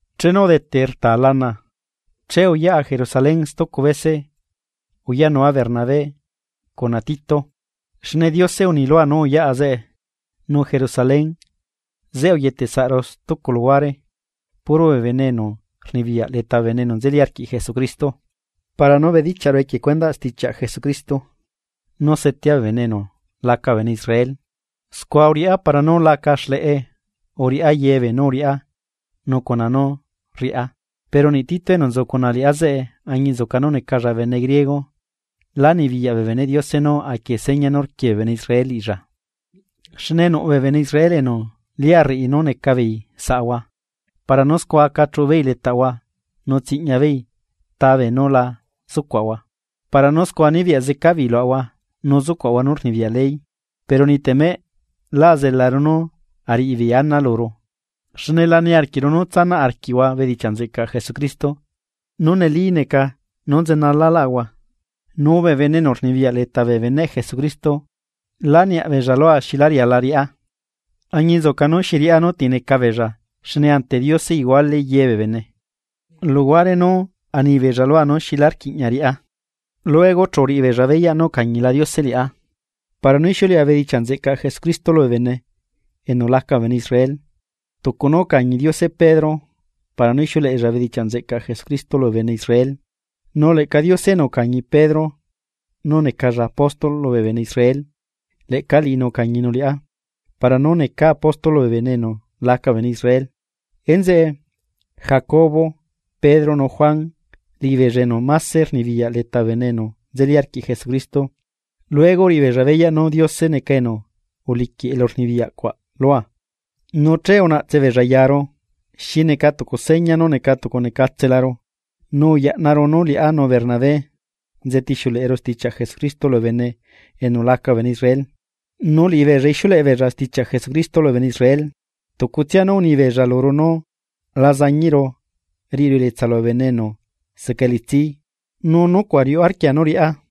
Chenu udete rta lana, che uyaꞌa Jerusalén stucu bese uyaꞌnua Bernabé cuna Tito. Xne Diose uni lua nú uyaꞌa zeꞌe. Nu Jerusalén, zeꞌe uyetesaꞌru stucu luhuare puro bee bene enu rnibiyaꞌ leta bee bene enu nzeli arquiꞌ Jesucristo para nú bedichiaꞌru equie cuendaꞌ stichiaꞌ Jesucristo nú setea bee bene enu laca bee bene Israel scua uriꞌá para nú laca xleꞌe uriꞌá yebeenú uriꞌá nu cuna nú rriꞌá. Pero niꞌ Tito enu nzu cuna liꞌá zeꞌe añinzuca nú necalla bene griego lá nibiyaꞌ bee beneꞌ Diose nú aquie seña nú rquie bee bene Israel liꞌilla. Xne nuꞌ bee bene Israel enu lia rriꞌi nu neca beei saꞌahua para nú scua aca chuꞌu beei letaꞌahua nu tsiꞌñia beei ta beenú la zucuaꞌahua, para nú scua nibiyaꞌ zeca beei luaꞌahua nú zucuaꞌahua nú rnibiyaꞌ ley. Pero niꞌ temeꞌ lá azelaru nú ariꞌibeei ana luru, xne la niarquiꞌru nú tsanaꞌ arquiꞌhua bedichiaꞌ nzeꞌcaꞌ Jesucristo nú neli neca nú nzenalalahua Nu bee bene enu rnibiyaꞌ leta bee beneꞌ Jesucristo lá niaꞌbeella lua xilá riala riꞌá, añinzuca nú xi riꞌá nú ti neca beella xne ante Diose iguale yebee bene. Luhuare nú anibeella lua nú xilá rquiꞌña riꞌá, luego chu uriꞌibeella beyaꞌ nú ucañila Diose liꞌá para nú ixiuleꞌa bedichiaꞌ nzeꞌcaꞌ Jesucristo lubee bene enu laca bee bene Israel, tucu nú ucañi Diose Pedro para nú ixiuleꞌella bedichiaꞌ nzeꞌcaꞌ Jesucristo lubee bene Israel. Nu leꞌca Diose enu ucañi Pedro nú necalla apóstol lubee bene Israel leꞌca liꞌinu ucañinu liꞌá para nú necaa apóstol lubee bene enu laca bee bene Israel. Enzeꞌe, Jacobo, Pedro nu Juan liꞌibeella enu máse rnibiyaꞌ leta bee bene enu nzeli arquiꞌ Jesucristo luego uriꞌibeella beyaꞌ nú Diose neca enu uliquiꞌ elurnibiyaꞌcuaꞌ lua. Nu che unaꞌtse beella yaru xi neca tucu seña nú neca tucunecatselaru, nu uyaꞌnaru nú liꞌá nu Bernabé nzetixiuleꞌeru stichiaꞌ Jesucristo lubee bene enu laca bee bene Israel. Nu liꞌibeella ixiuleꞌebeella stichiaꞌ Jesucristo lubee bene Israel. Tucutsia nú unibeella luru nú la zañiꞌru riꞌiru elietsa lubee bene enu seca elitsi nu nucuaꞌ riuꞌ arquia nú riꞌá.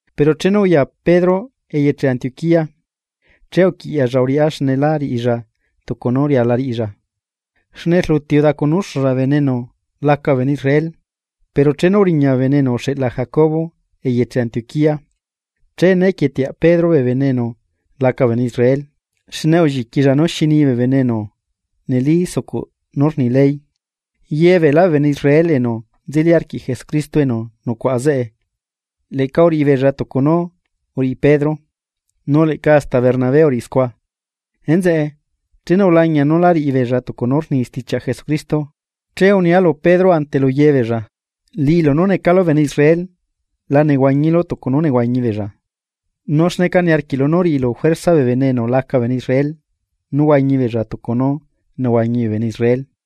Pero chenu uya Pedro eyeche Antioquía, che uquiꞌyaꞌlla uriꞌá xne la riꞌilla tucu nú riala riꞌilla, xne rluti udacunuuxulla bee bene enu laca bee bene Israel. Pero chenu uriña bee bene enu uxeꞌla Jacobo eyeche Antioquía che né quieteaꞌ Pedro bee bene enu laca bee bene Israel xne ulliquilla nú xi ni bee bene enu neli sucuꞌ nú rni ley. Ye beelá bee bene Israel enu nzeli arquiꞌ Jesucristo enu nucuꞌa zeꞌe leꞌca uriꞌibeella tucu nú uriꞌi Pedro, nu leꞌca hasta Bernabé uriꞌi scua. Enzeꞌe, chenu ulañia nú la riꞌi beella tucu nú rni stichiaꞌ Jesucristo che unia lu Pedro ante lu yebeella: “Liꞌilu nú necalu bene Israel la nehuañilu tucu nú nehuañi beella. ¿Nu xneca niarquiꞌlu nú riꞌilu juerza bee bene enu laca bee bene Israel nú huañi beella tucu nú nehuañi bee bene Israel?”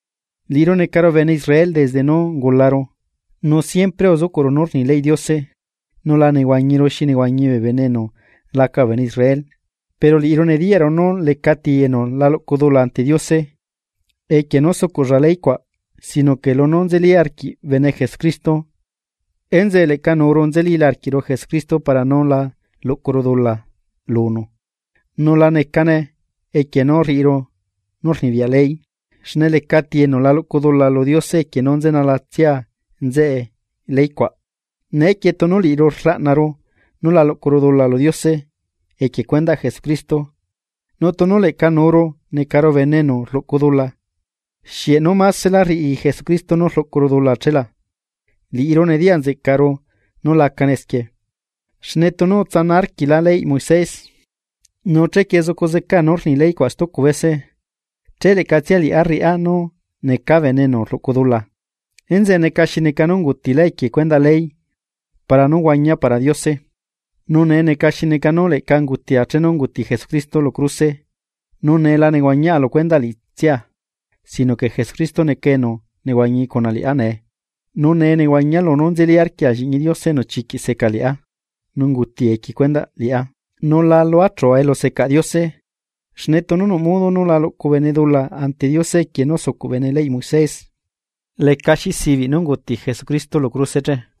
Liꞌiru necaru bene Israel desde nú ungularu nu siempre uzucuꞌru nú rni leyꞌ Diose nu la nehuañiru xi nehuañi bee bene enu laca bee bene Israel. Pero liꞌiru nediyaꞌru nú lecati enu la luꞌcu dula ante Diose equie nú sucuꞌlla ley cuaꞌ sino que lunú nzeli arquiꞌ bene Jesucristo, enzeꞌe leꞌca nuuru nzelila arquiꞌru Jesucristo para nú la luꞌcuru dula lunu, nu la necane equie nú rriꞌiru nú rnibiyaꞌ ley, xne lecati enu la luꞌcu dula lu Diose equie nú nzenalatsia nzeꞌe ley cuaꞌ. Neequie tunu liꞌiru rlaꞌnaru nú la luꞌcuru dula lu Diose equie cuendaꞌ Jesucristo, nu tunu leꞌca nuuru necaru bene enu rluꞌcu dula, ¿xieꞌ nú másela rriꞌi Jesucristo nú rluꞌcuru dula che la? Liꞌiru nediyaꞌ nzeꞌcaꞌru nú lacane esquie, xne tunu utsana arquilá leyꞌ Moises, nu chequie zucu zeca nú rni ley cuaꞌ stucu bese, che leꞌcatsia liꞌá rriꞌá nú necaa bene enu rluꞌcu dula. Enzeꞌe neca xi neca nú ungutilá equie cuendaꞌ ley para nú huañia para Diose. Nu nee neca xi neca nú leꞌca ungutia chenu unguti Jesucristo lu cruse nu nee la nehuañiaꞌa lu cuendaꞌ liꞌitsia sino que Jesucristo neca enu nehuañi cuna liꞌá nee. Nu nee nehuañia lunú nzeli arquia lliꞌñi Diose enu chiquiꞌ seca liꞌá nu unguti equie cuendaꞌ liꞌá. Nu la luachua elusecaꞌ Diose xne tunu nuꞌ modo nú la luꞌcu bene dula ante Diose equie nú sucuꞌ bene leyꞌ Moisés, lecaxi sibiꞌ nú unguti Jesucristo lu cruse che.